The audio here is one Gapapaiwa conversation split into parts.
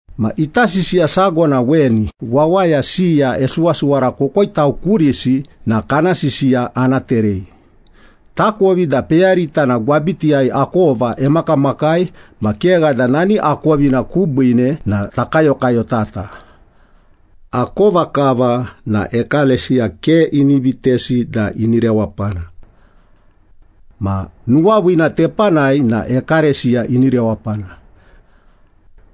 Ma ita sisiya sago na weni, wawaya siya esuwasuwara kokoitau kurisi na kana sisiya ana terei. Takovi da peyarita na gwabitiyai akova emakamakai, ma kegha da nani akovina kubiine na takayokayotata. Akova kava na ekalesiya ke ini vitesi da ini rewapana. Ma nuwaviina tepanai na ekalesiya ini rewapana.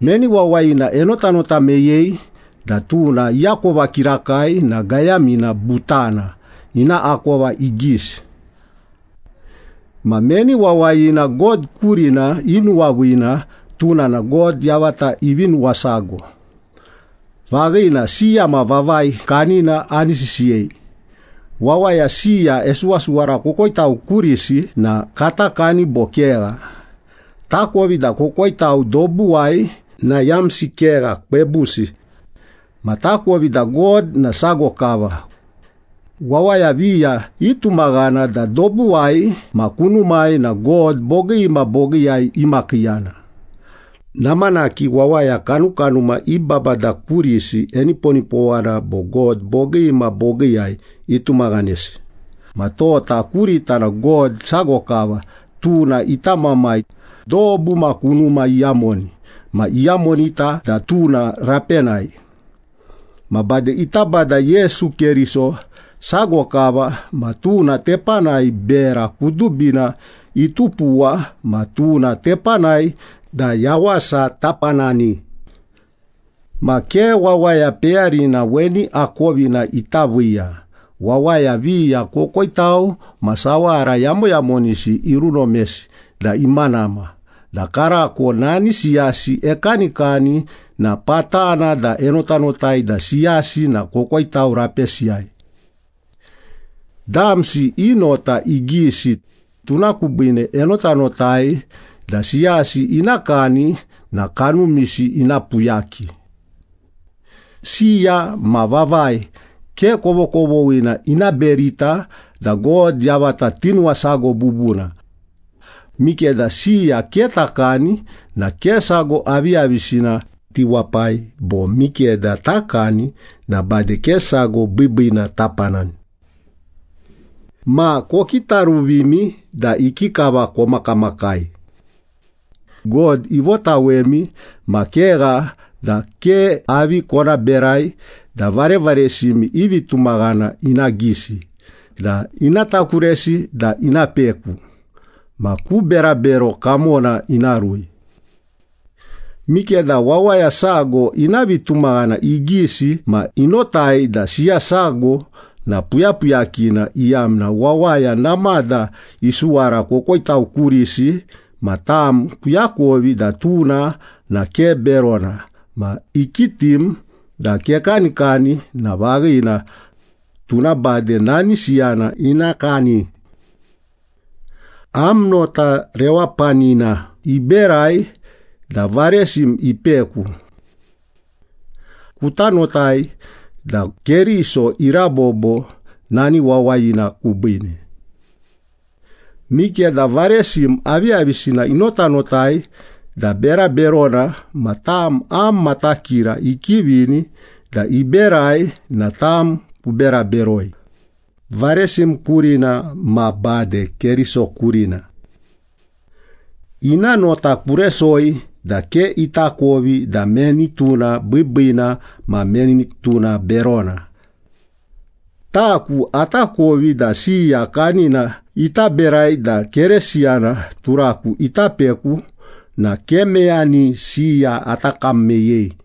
Meni wawayina enotanota meyei da tuna iakova kirakai na gayamina butana, ina akova igisi. Ma meni wawayina God kurina inuwaviina, tuna na God yavata ivi nuwasago. Vaghina, siya ma vavai kanina ani sisiyei. Wawaya siya esuwasuwara kokoitau kurisi na kata kani bo kegha? Takovi da kokoitau dobuwai na yamsi kegha, kwebusi. Ma takovi da God na sago kava. Wawaya viya itumaghana da dobuwai ma kunumai na god bogii ma bogiiyai imakiiyana. Namanaki wawaya kanukanuma i babada kurisi eniponipowana bo god bogii ma bogiiyai itumaghanesi, ma tota kurita na God sago kava, tuna ita Mamai, dobu ma kunuma iyamoni ma iyamonita da tuna rapenai. Ma bade ita Bada Yesu Keriso sago kava, ma tuna tepanai bera kudubina itupuwa ma tuna tepanai da yawasa tapanani. Ma ke wawaya peyarina weni akovina ita viiya, wawaya viya kokoitau ma sawara yamoyamonisi irunomesi da imanama da karako nani siyasi ekanikani na patana da enotanotai da siyasi na kokoitau rapesiyai. Damsi i nota igisi, tuna kubiine enotanotai da siyasi ina kani na kanumisi ina puyaki. Siya ma vavai ke kovokovoghina ina berita da God yavata tinuwasago bubuna. Mikeda siya ke takani na ke sago aviyavisina tiwapai, bo mikeda takani na bade ke sago biibiina tapanani. Ma kokitaruvimi da ikikava komakamakai. God ivotawemi ma kegha da ke avi kona berai da varevaresimi i vitumaghana ina gisi na ina takuresi da ina peku ma ku berabero kamona ina rui. Mikeda wawaya sago ina vitumaghana igisi ma inotai da siya sago na puyapuyakina iyamna wawaya namada isuwara kokoitau kurisi ma tam kuakovi da tuna na ke berona ma ikitim da kekanikani na vaghina, tuna bade nani siyana ina kani. Am nota rewapanina iberai da varesim ipeku. Kuta notai da Keriso irabobo nani wawayina kubiine. Mikeda varesim aviyavisina inotanotai da bera berona ma tam am matakira ikivini da iberai na tam kubera beroi, varesim kurina ma bade Keriso kurina. Ina nota kuresoi da ke itakovi da meni tuna biibiina ma meni tuna berona. Taku atakovi da siya kanina ita berai da Keresiyana turaku ita peku na ke meyani siya ata kam meyei.